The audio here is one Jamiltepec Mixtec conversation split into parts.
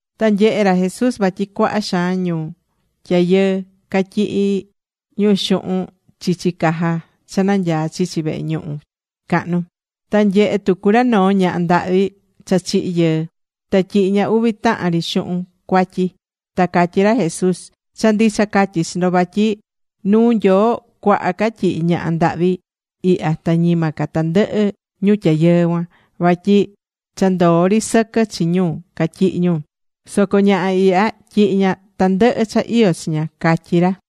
Ta nyehe̱ ra Jesús vatyi cuaha xaan ñu tyayɨɨ catyihí ra xuhun chichi caja cha nanyaá chichi vehe ñuhu cahnu. Ta nyehe̱ tucu ra noo ñaha ndahvi cha chihi̱ yɨɨ. Ta tyihi̱ ña uvi tahan ri xuhun cuatyi. Ta catyí ra Jesús: ―Cha ndicha catyí chi ndo vatyi nuu Nyoo cuaha ca tyihi̱ ñaha ndahvi ihya ta ñima ca tandɨhɨ ñu tyayɨɨ cuan. Vatyi cha ndoó ri sɨquɨ chi ñu catyihi̱ ñu. Soco ñaha ihya tyihi̱ ña tandɨhɨ cha iyó chi ña ―catyí ra.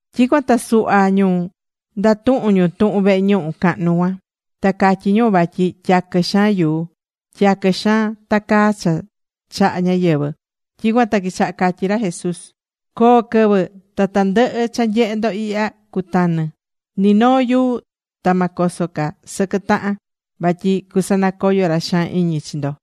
Tyicuan ta suhva ñu ndatuhún ñu tuhun vehe ñuhu cahnu cuan. Ta catyí ñu vatyi tyaquɨ xaan yuu. Tyaquɨ xaan tacaá cha chaha̱ ñáyɨvɨ. Tyicuan ta quichaha catyí ra Jesús: ―Coo quɨvɨ ta tandɨhɨ cha nyehé ndo ihya cutanɨ. Ni noo yuu ta ma coso ca sɨquɨ tahan. Vatyi cusanacoyo ra xaan iñi chi ndo.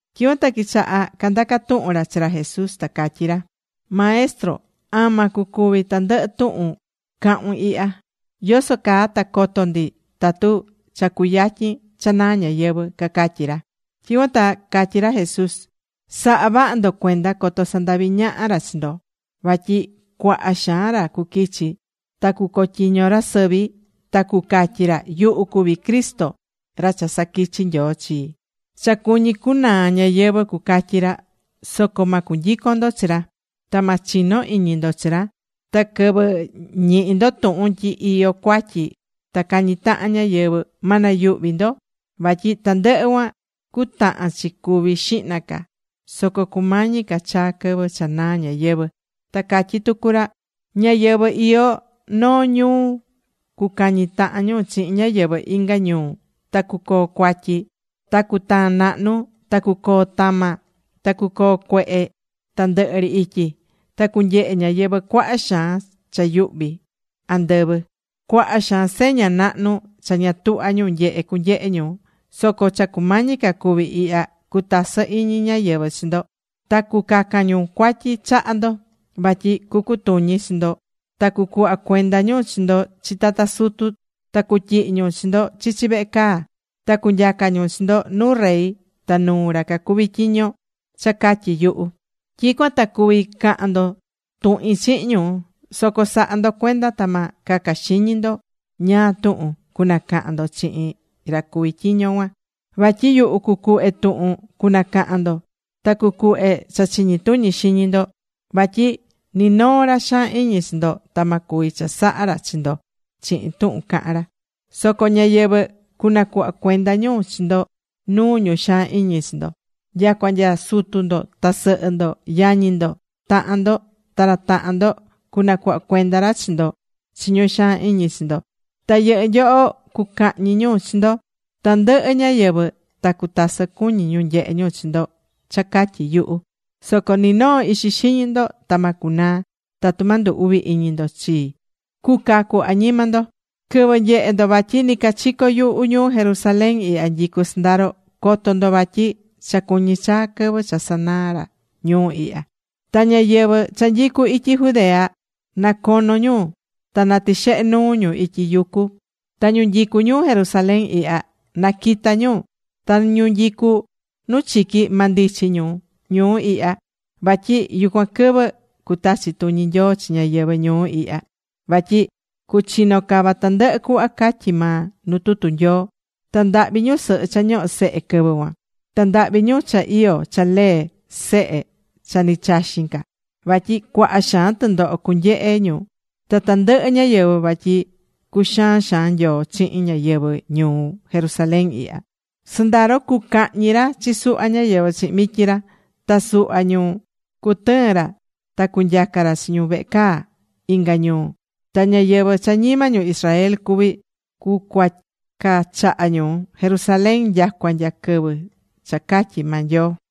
Tyicuan ta quichaha candaca tuhun ra chi ra Jesús, ta catyí ra: ―Maestro, ¿ama cucuvi tandɨhɨ tuhun cahun ihya? ¿Yoso caa ta coto ndi tatu cha cuyatyin cha naa ñayɨvɨ̱? ―cacatyí ra. Tyicuan ta catyí ra Jesús: ―Sa̱ha vaha ndo cuenda, coto sandavi ñaha ra chi ndo. Vatyi cuaha xaan ra cuquichi, ta cucotyiño ra sɨvi, ta cucatyi ra: “Yuhu cuví Cristo ra cha saquichi̱ Nyoo chi. Cha cuñí cunaa ñayɨvɨ̱”, cucatyi ra. Soco ma cunyicon ndo chi ra. Ta ma chino iñi ndo chi ra. Ta quɨvɨ ñihi ndo tuhun tyi iyó cuatyi ta cañí tahan ñáyɨvɨ, ma nayuhvi ndo. Vatyi tandɨhɨ cuan cutahan chi cuvi xihna ca. Soco cumañi ca chaa quɨvɨ cha naa ñayɨvɨ̱. Ta catyí tucu ra: ―Ñáyɨvɨ iyó noo ñuu cucañi tahan ñu chihin ñáyɨvɨ inga ñuu. Ta cucoo cuatyi. Ta cutaan nahnu. Ta cucoo tama. Ta cucoo cuehe tandɨhɨ ri ityi. Ta cunyehe ñáyɨvɨ cuaha xaan cha yuhví andɨvɨ. Cuaha xaan seña nahnu cha ña tuhvá ñu nyehe cunyehe ñu. Soco cha cumañi ca cuvi ihya, cutasɨ iñi ñáyɨvɨ chi ndo. Ta cucacan ñu cuatyi chaha ndo. Vatyi cucutuñi chi ndo ta cucuhva cuenda ñu chi ndo chi tata sutu. Ta cutyihi ñu chi ndo chichi vehe caa. Ta cunyaca ñu chi ndo nuu rey ta nuu ra cacuví tyiño cha catyi yuhu. Tyicuan ta cuvi cahan ndo tuhin chihin ñu. Soco sa̱ha ndo cuenda ta ma caca xiñi ndo ñáá tuhun cunacahan ndo chihin ra cuví tyiño cuan. Vatyi yuhu cucuhve tuhun cunacahan ndo. Ta cucuhve cha chiñi tuñi xiñi ndo. Vatyi ni noo ra xaan iñi chi ndo ta ma cuvi chasaha ra chi ndo chihin tuhun cahán ra. Soco ñáyɨvɨ cunacuhva cuenda ñu chi ndo nuu ñu xaan iñi chi ndo. Nyacua nya sutu ndo ta sɨhɨ ndo, yañi ndo, tahan ndo, ta ra tahan ndo cunacuhva cuenda ra chi ndo chi ñu xaan iñi chi ndo. Ta yɨhɨ́ nyoho cucahñi ñu chi ndo. Tandɨhɨ ñáyɨvɨ ta cutasɨ cuñí ñu nyehe ñu chi ndo cha catyi yuhu. Soco ni noo ixi xiñi ndo ta ma cunaa. Tatu ma ndu uvi iñi ndo chii, cucacu añima ndo. ’Quɨvɨ nyehe ndo vatyi nicachico yuhu ñuu Jerusalén ihya nyicú sɨndaro, co̱to ndo vatyi cha cuñi chaa quɨvɨ cha sanaa ra ñuu ihya. Ta ñáyɨvɨ cha nyicú ityi Judea, na cono ñu ta na tixehe nuu ñu ityi yucu. Ta ñu nyicú ñuu Jerusalén ihya, na quita ñu. Ta ñu nyicú nu chiqui, ma ndichi ñu ñuu ihya. Vatyi yucuan quɨvɨ cutachi tuñi Nyoo chi ñáyɨvɨ ñuu ihya. Vatyi cuchino cava tandɨhɨ cuhva catyí maa nu tutu Nyoo. Ta ndahvi ñusɨhɨ cha ñohó sehe quɨvɨ cuan. Ta ndahvi ñu cha iyó cha lee sehe cha ni chaxín ca. Vatyi cuaha xaan tɨndoho cunyehe ñu ta tandɨhɨ ñáyɨvɨ. Vatyi cuxaan xaan Nyoo chihin ñáyɨvɨ ñuu Jerusalén ihya. Sɨndaro cucahñi ra chi suhva ñáyɨvɨ chihin mityi ra. Ta suhva ñu cutɨɨn ra ta cunyaca ra chi ñu vehe caa inga ñuu. Ta ñáyɨvɨ cha ñima ñu Israel cuví, cucuaca chaha ñu Jerusalén nyacua nya quɨvɨ cha catyí maa Nyoo.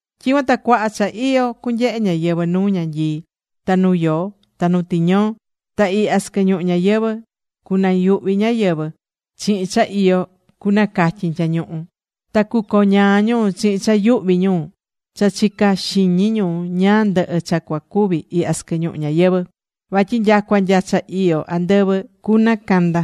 ’Tyicuan ta cuaha cha iyo cunyehe ñáyɨvɨ nu ñanyii, ta nu yoo, ta nu tiñoo. Ta ihya sɨquɨ ñuhu ñayɨvɨ̱ cunayuhvi ñáyɨvɨ chihin cha iyo cunacatyin tyañuhu. Ta cucoñaa ñu chihin cha yuhví ñu cha chicá xiñi ñu ñáá ndɨhɨ cha cua cuvi ihya sɨquɨ ñuhu ñayɨvɨ̱. Vatyi nyacua nya cha iyó andɨvɨ cunacanda.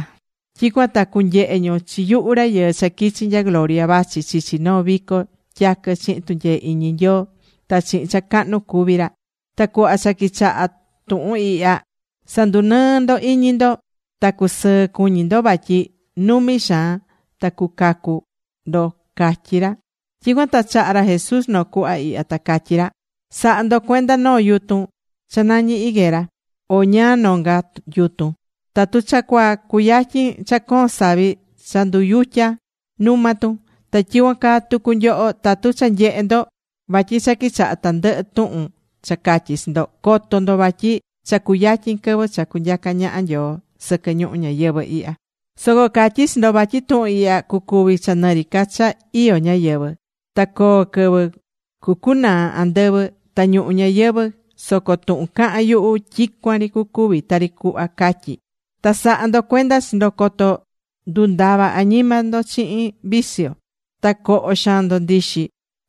Tyicuan ta cunyehe ñu chi yuhu Rayɨɨ cha quichi̱ nya gloria vachi chichi noo vico tyaquɨ chihin tunyee iñi Nyoo, ta chihin cha cahnu cuví ra. Ta cuhva cha quichaha tuhun ihya, sa̱ndunɨɨ ndo iñi ndo ta cu̱sɨɨ cuñi ndo vatyi numi xaan ta cucacu ndo ―catyí ra. Tyicuan ta chaha̱ ra Jesús noo cuhva ihya, ta catyí ra: ―Sa̱ha ndo cuenda noo yutun cha nañí higuera, o ñáá nonga yutun. Tatu cha cua cuyatyin cha coon savi cha nduyutya numa tun. Ta tyicuan caa tucu nyoho, tatu cha nyehe ndo vatyi cha quichaha tandɨhɨ tuhun cha catyí chi ndo, co̱to ndo vatyi cha cuyatyin quɨvɨ cha cunyaca ñaha Nyoo sɨquɨ ñuhu ñayɨvɨ̱ ihya. ’Soco catyí chi ndo vatyi tuhun ihya cucuvi cha nɨ ri ca cha iyó ñáyɨvɨ. Ta coo quɨvɨ cucunaa andɨvɨ ta ñuhu ñayɨvɨ̱, soco tuhun cahán yuhu, tyicuan ri cucuvi tari cuhva catyí. ’Ta sa̱ha ndo cuenda chi ndo coto ndundava añima ndo chihin vicio, ta coho xaan ndo ndixi,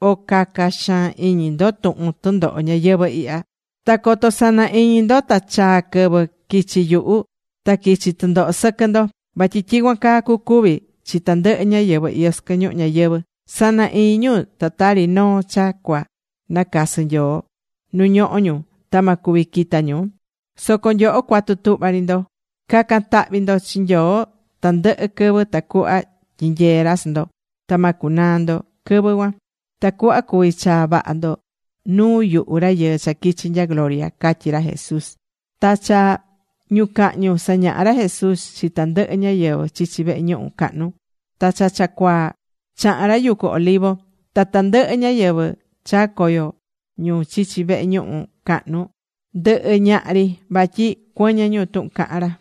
o caca xaan iñi ndo tuhun tundoho ñayɨvɨ̱ ihya. Ta coto sana iñi ndo ta chaa quɨvɨ quichi yuhu ta quichi tundoho sɨquɨ ndo. Vatyi tyicuan caa cucuvi chi tandɨhɨ ñáyɨvɨ iyó sɨquɨ ñuhu ñayɨvɨ̱. Sana iñi ñu ta tari noo cha cua nacasɨ Nyoo nu ñohó ñu ta ma cuvi quita ñu. Soco nyoho cua̱tu tuhva ri ndo. Ca̱can tahvi ndo chi Nyoo tandɨhɨ quɨvɨ, tacuhva tyinyee ra chi ndo. Ta ma cunaa ndo quɨvɨ cuan, tacuhva cuvi chaa vaha ndo nuu yuhu Rayɨɨ cha quichi nya gloria ―catyí ra Jesús. Ta cha ñucahñu sañahá ra Jesús chi tandɨhɨ ñáyɨvɨ chichi vehe ñuhu cahnu. Ta cha cha cuaa chahán ra yucu Olivo. Ta tandɨhɨ ñáyɨvɨ chaa̱ coyo ñu chichi vehe ñuhu cahnu ndɨhɨ ñaha ri. Vatyi cuɨñɨ ñu tuhun cahán ra.